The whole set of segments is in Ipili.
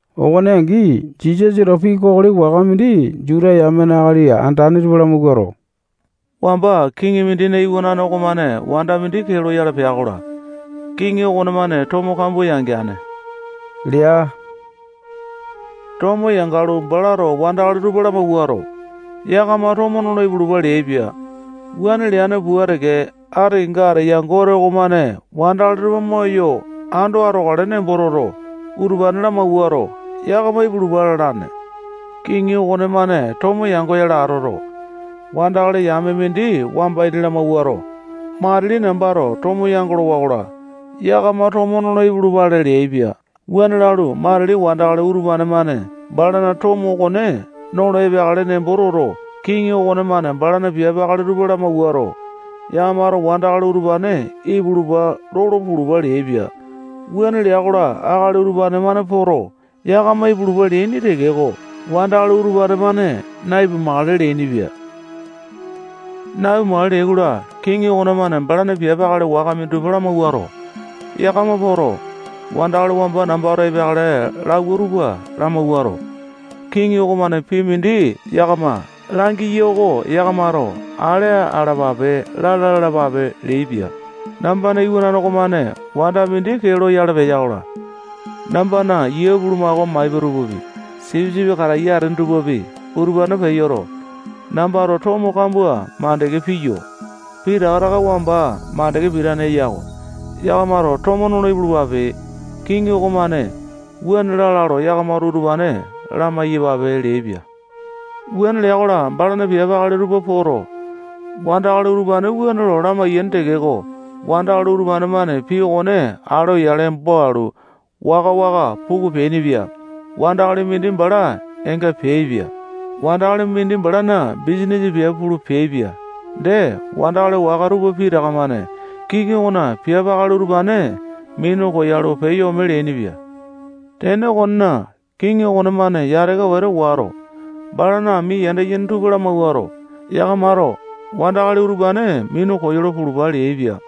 Okone angi, Jisasato pii kokoli waka mindi Juta yamena akali andane tupa lamawuato, wamba kiŋi mindina iwanane okomane wanda mindi kee loyale pea-kola, kiŋi okonemane tomo kambua yangeane lea. Tomo yangalu, balato wandakali tupa lamawuato, yakama tomo nolo ipulupa leaipia. Wuane leane pua teke, ati kenga ateya Gote okomane wandakali tupa moyo ando atokale nembo toto, utupane lamawuato, yakama ipulupa lalane. Kiŋi okonemane tomo yangoyale atoto, wandakali yame mindi wamba ini lamawuato, matili nambato tomo yandolo-wakola, yakama tomo nolo ipulupale leaipia. Wuane lalu, matili wandakali utupane-mane balana tomo okone nolo epeakale nembo toto, kiŋi okonemane balana piape akali tupa lamawuato, yakamato wandakali utupane ipulupa lolo pulupa leaipia. Wuane lea-kola, akali utupane-mane poto, yakama ipulupa leaini tekeko, wandakali utupane-mane na-ipumakale leainipia. Na-ipumakale leai-kola, kiŋi okonemane balana piape akali waka minditupa lamawuato, yakama poto, wandakali wamba nambato epeakale lauwa tupa lamawuato, kiŋi okomane pii mindi yakama langiya oko yakamato ale alapape lala lalapape leaipia. Nambana iwanane okomane wanda mindi kee loyale peya-kola, nambana yia bulumako maipa tupapi, sipisipi kataiya atene tupapi, utupane peyoto, nambato tomo kambua makande piyo. Pitaka taka wamba makande pitane eya-ko. Yakamato tomo nolo ipulupape. Kiŋi okomane wuane lala lo yakamato utupane lamai-yapape leaipia. Wuane lea-kola, balana piape akali tupa poto, wandakali utupane wuane lo lamaiyai tekeko, wandakali utupane-mane pii okone ale oyale embo alu, waka-waka puku peainipia. Wandakali mindi bala eenga peaipia. Wandakali mindi balana bisanisa piape pulu peaipia. Dee, wandakali waka tupa pitaka-mane kiŋi okona piape akali utupane minu koyalu, peyo ome leainipia. Tene okonena, kiŋi okonemane yataka wete wato, balana ami yanda yene tupa lamawuato, yakamato wandakali utupane minu koyolo pulupa leaipia.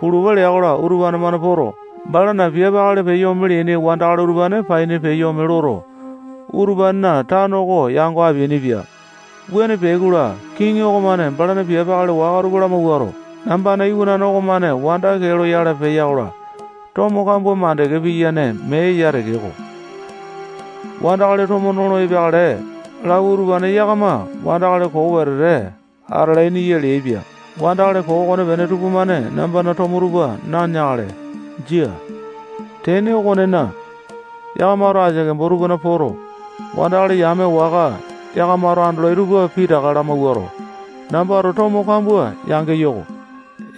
Pulupa lea-kola, utupane-mane poto, balana piape akali peyo leaini wandakali utupane paini peyo ome loto, utupanena tano oko yango apeainipia. Wuane peai-kola, kiŋi okomane balana piape akali waka tupa lamawuato, nambana iwanane okomane wanda kee loyale peya-kola, tomo kambua makande piyene mee eya tekeko, wandakali tomo nolo epeakale lauwa utupane yakama wandakali koo wete atalaini ya leaipia. Wandakali koo okonepene tupamane nambana tomo tupa naneakale. Jia. Tene okonena, yakamato asia kembo tupana poto, wandakali yame waka yakamato andolai tupa pitaka lamawuato, nambato tomo kambua yangeyo-ko.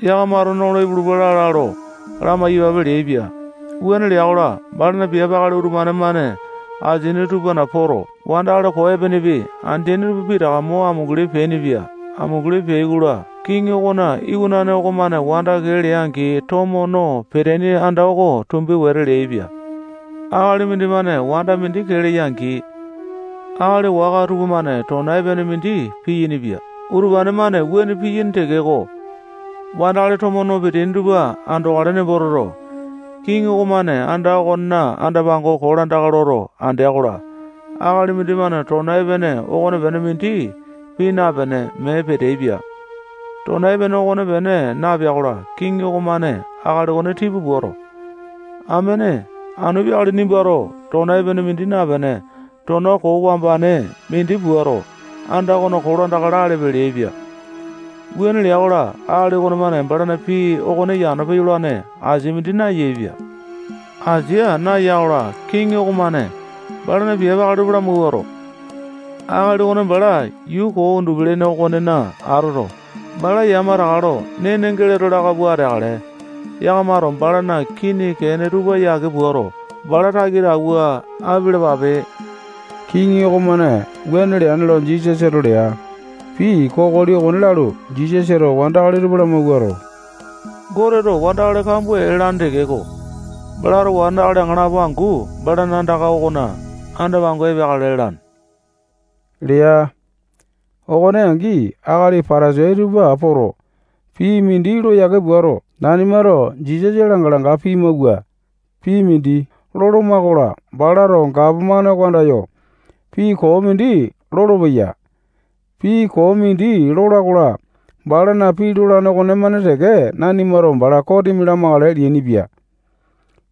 Yakamato nolo ipulupa lala lo lamai-yapape leaipia. Wuane lea-kola, balana piape akali utupane-mane asini tupana poto, wandakali koo epenepi andeaini tupa pitaka mo amunguli peainipia. Amunguli peai-kola, kiŋi okona iwanane okomane wanda kee lea-angi, tomo no peteaini anda oko tumbi wete leaipia. Akali mindimane wanda mindi kee leya-angi, akali waka tupamane tona epene mindi piyainipia. Utupane-mane wuane piyaini tekeko, wandakali tomo no peteaini tupa andokale nembo toto, kiŋi okomane anda okona anda-pango kolandaka loto andea-kola, akali mindimane tona epene okonepene mindi pii napene, mee peteaipia. Tona epene okonepene napea-kola, kiŋi okomane akali okone tipa puato, amene, anu peakale nimbato tona epene mindi napene, tona koo wambane mindi puato, anda okona kolandaka lalepe leaipia. Wuane lea-kola, akali okonemane balana pii okone yano peyolane asia mindi nayaepia. Asia naya-kola, kiŋi okomane balana piape akali tupa lamawuato, akali okone bala yuu koo undupi-lene okonena atoto, bala yamataka lo nene geleto laka pua ateakale. Yakamato balana kini kene tupa yake puato, bala takita awua apialapape. Kiŋi okomane wuane leane lo Jisasato lea. Pii kokoli okone lalu, Jisasato wandakali tupa lamawuato, Goteto wandakali kambua ee lalane tekeko, balato wandakali aŋalapo angu balana anda okona anda-pango epeakale lalane lea. Okone angi, akali Patasai tupa poto, pii mindi lo yake puato, nanimato Jisasa langa-langa pimawua pii mindi loloma-kola, balato gapomane oko andayo pii koo mindi lolopeya. Pii koo mindi lola-kola, balana pii lolane okonemane teke nanimato bala kosimi lamakale leainipia.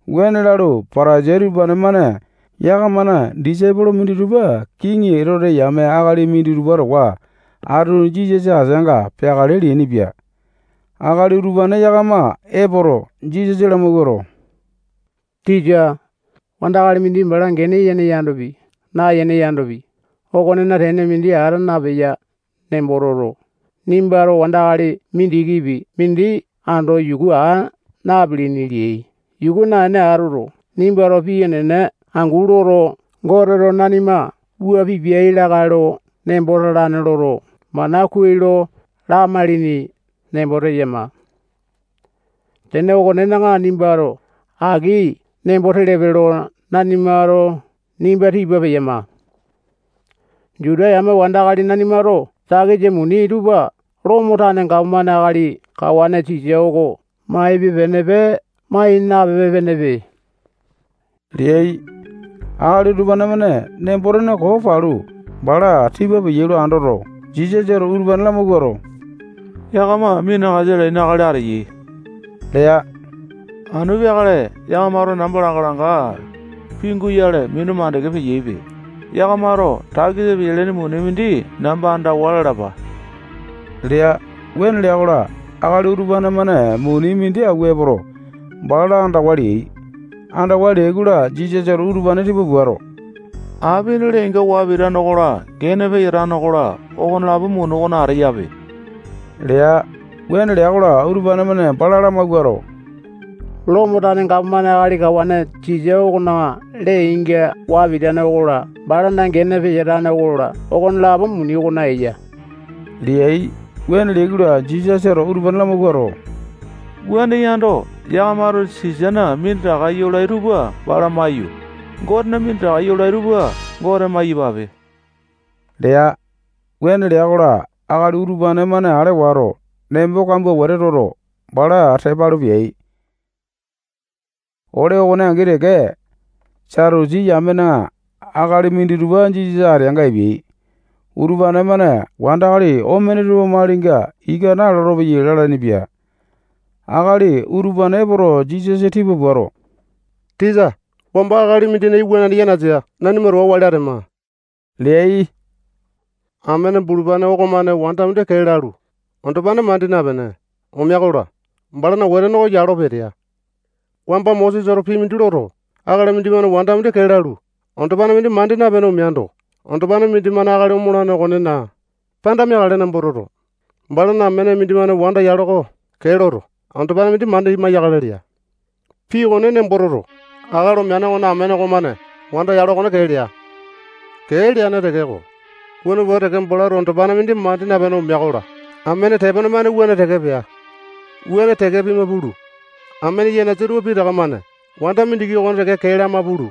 Wuane lalu, Patasai utupane-mane yakamana disaipolo minditupa kiŋi Etote yame akali minditupa towa atu Jisasa ateanga peakale leainipia. Akali utupane yakama epoto, Jisasa lamawuato, tisa, wandakali mindi bala gene yene yandopi, nayene yandopi, okonena tene mindi ata napeya nembo toto, nimbato wandakali mindikipi mindi ando yuku aa napilini leai. Yuku naene atoto, nimbato pii enene angu loto, Goteto nanima wua pipiai lakae lo nembo talane loto, mana kuai lo lamailini nembo teyama. Tene okonena, nimbato aki nembo telepe lo nanimato nimba tipa peyama. Juta yame wandakali nanimato takisa muni tupa Lomo tane gapomane akali kawane Sisa oko maipe-penepe, mai napipe-penepe leai. Akali utupane-mane nembo-tene koo palu, bala tipa peai lo andoto, Jisasato utupane lamawuato, yakama minakasa alaini akali ateyai lea. Anu peakale yakamato namba langa-langa pinguyale minu makande peyaipe. Yakamato takisa peyalaini muni mindi namba andawa lalapa lea. Wuane lea-kola, akali utupane-mane muni mindi awua epoto, bala andawa leai. Andawa leai-kola, Jisasato utupane tipa puato, apina lee-inga waa pitane okola, gene peyatane okola, okonelapo muni okona ateyape lea. Wuane lea-kola, utupane-mane bala lamawuato, Lomo tane gapomane akali kawane Sisa okona lee-inga waa pitane okola, balana gene peyatane okola, okonelapo muni okona eya leai. Wuane leai-kola, Jisasato utupane lamawuato, wuane yando, yakamato Sisana minditaka yolai tupa bala maiyu, Gotena minditaka yolai tupa Gote maiyapape leai. Wuane lea-kola, akali utupane-mane ale wato, nembo kambua wete toto, bala tepa alu peai. Ole okone angi teke, Satusi yamena akali minditupa Jisasa ateanga epeai. Utupane-mane wandakali omene tupa malinga ika nalolo-peyai lalainipia. Akali utupane epoto, Jisasa tipa puato, tisa, wamba akali mindina iwanane yanasa nanima towa wali atema leai. Amene bulupane okomane wanda mindi kee lalu, andopane mandi napene, omea-kola, balana wetene oko yalo petea. Wamba Mosesato pii mindi loto, akali mindimane wanda mindi kee lalu, andopane mindi mandi napene omeando, andopane mindimane akali omolane okonena panda meakale nembo toto, balana amene mindimane wanda yalo oko kee loto, andopane mindi mandi maiyakale lea. Pii okone nembo toto, akali omeane okonena amene okomane wanda yalo okone kee lea. Kee leane tekeko, wuane pua teke balato andopane mandi napene omea-kola, amene tepone-mane wuane teke pea. Wuane teke pima pulu, amene yanasa tupa pitaka-mane wanda mindiki okone teke kee lama pulu,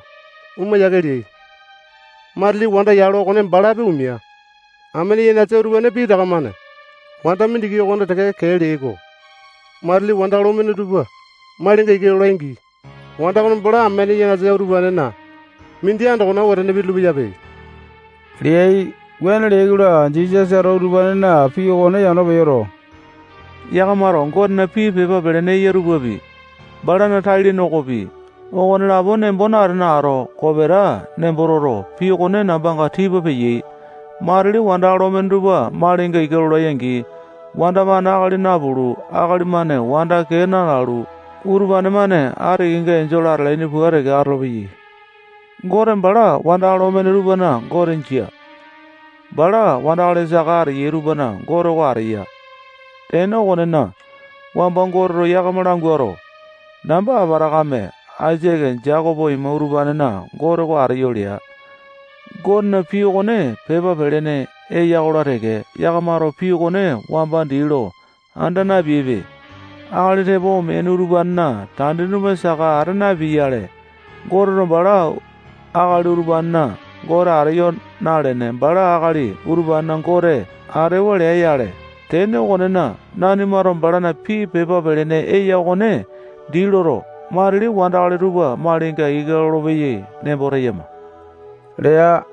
oma yiake leai. Matili wanda yalo okone balapi omea. Amene yanasa utupane pitaka-mane wanda mindiki okone teke kee leai-ko. Matili wandakali omene tupa malinga ika lolai-angi, wanda okone bala amene yanasa utupanena mindi andokona wetene pitulu-peyape leai. Wuane leai-kola, Jisasato utupanena pii okone yano peyoto, yakamato Gotena pii pepa pelene eya tupapi, balana tai-lene okopi, okonelapo nembo natene ato, kopeta nembo toto, pii okone nambanga tipa peyai. Matili wandakali omene tupa malinga ika lolai-angi, wanda-mane akali napulu, akali-mane wanda kee na-lalu, utupane-mane ati kenga enjole atalaini pua teke atolopeyai. Gote bala wandakali omene tupana Gote jia. Bala wandakali saka ateyai tupana Gote oko ateya. Tene okonena, wamba Goteto yakama languato, namba Apatakame, Aisake, Jekopo ima utupanena Gote oko ateyo lea. Gotena pii okone pepa pelene eya-kola teke, yakamato pii okone wamba dii lo anda napeaipe. Akali tepo omeaini utupanena tandini tupa saka ata napea-yale, Goteto bala akali utupanena Gote ateyo nalene, bala akali utupanena Gote atewa lea-yale. Tene okonena, nanimato balana pii pepa pelene eya okone dii loto, matili wandakali tupa malinga ika lolopeyai nembo teyama lea.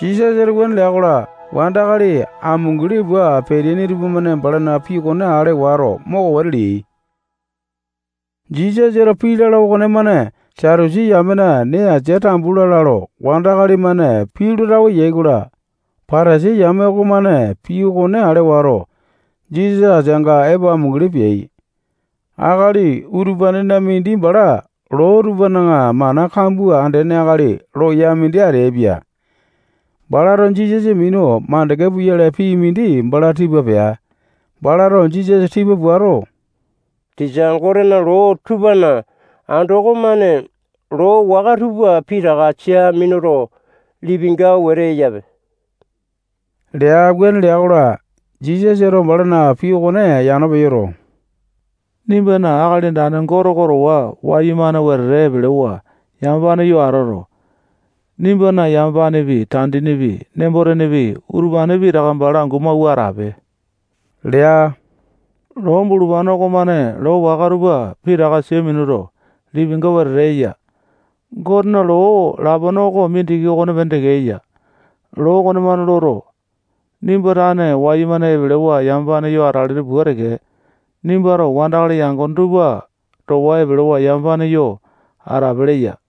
Jisasato wuane lea-kola, wandakali amunguli pua peteaini tupamane balana pii okone ale wato, moko wete leai. Jisasato pii lala okonemane Satusi yamena nee asia tambu lala lo wandakali-mane pii lo tawe yai-kola, Patasai yame okomane pii okone ale wato, Jisasa ateanga epo amunguli peai. Akali utupanena mindi bala loo tupana mana kambua andene akali loya mindi ateaipia. Balato Jisasa minu makande puyale pii mindi bala tipa pea. Balato Jisasa tipa puato, tisa, Gotena loo tupana andoko-mane loo waka tupa pitaka sia minuto, lipinga wete eyape lea. Wuane lea-kola, Jisasato balana pii okone yano peyoto, nimbana Akali Andane Gote oko towa wayumane wetete epelewa yamapane yo atoto, nimbana yamapanepi, tandinipi, nembo-tenepi, utupane pitaka bala angu mawua atape lea. Loo bulupane okonemane loo waka tupa pitaka sia minuto, lipinga wetete eya. Gotena loo lapone oko mindiki okopene teke eya. Loo okonemane loto, nimba tane wayumane epelewa yamapane yo atalene pua teke, nimbato wandakali yangone tupa towa epelewa yamapane yo atape leya.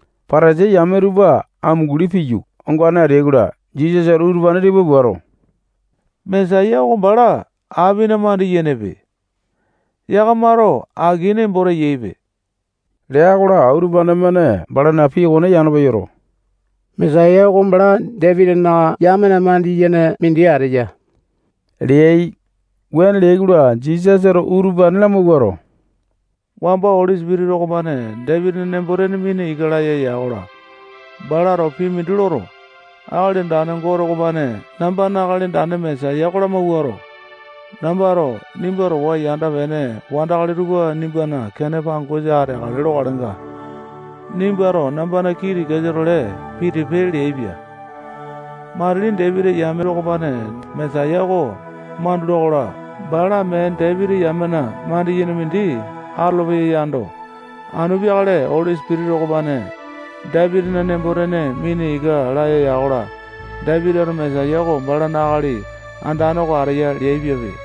Patasai yame tupa amunguli piyu, ongane ateai-kola, Jisasato utupane tipa puato, Mesaya oko bala apina mandi-yenepe. Yakamato aki nembo teyaipe lea-kola, utupane-mane balana pii okone yano peyoto, Mesaya oko bala Dapitina yamena mandiyene mindi ateya leai. Wuane leai-kola, Jisasato utupane lamawuato, wamba Oli Sipitisa okomane Dapitina nembo-tene mina ika laya ya-kola, balato pii mindi loto, Akali Andane Gote okomane nambana Akali Andane Mesaya oko lamawuato, nambato nimba towa yanda-pene wandakali tupa nimbana kene pangosa ateakale lokalenga, nimbato nambana kii tikasa-tole pitipe leaipia. Matili Dapitina yame okomane Mesaya oko mandula-kola, bala mee Dapiti yamena mandiyene mindi atolopeya yando, anu peakale Oli Sipitisa okomane Dapitina nembo-tene mina ika laya ya-kola, Dapitito Mesaya oko balana Akali Andane oko ateya leaipiape.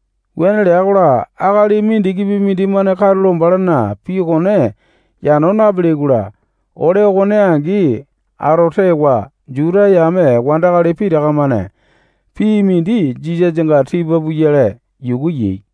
Wuane lea-kola, akali mindikipi mindimane katulo balana pii okone yano napeleai-kola, ole okone angi ato tewa, Juta yame wandakali pitaka-mane pii mindi Jisasanga tipa puyale yuku yai.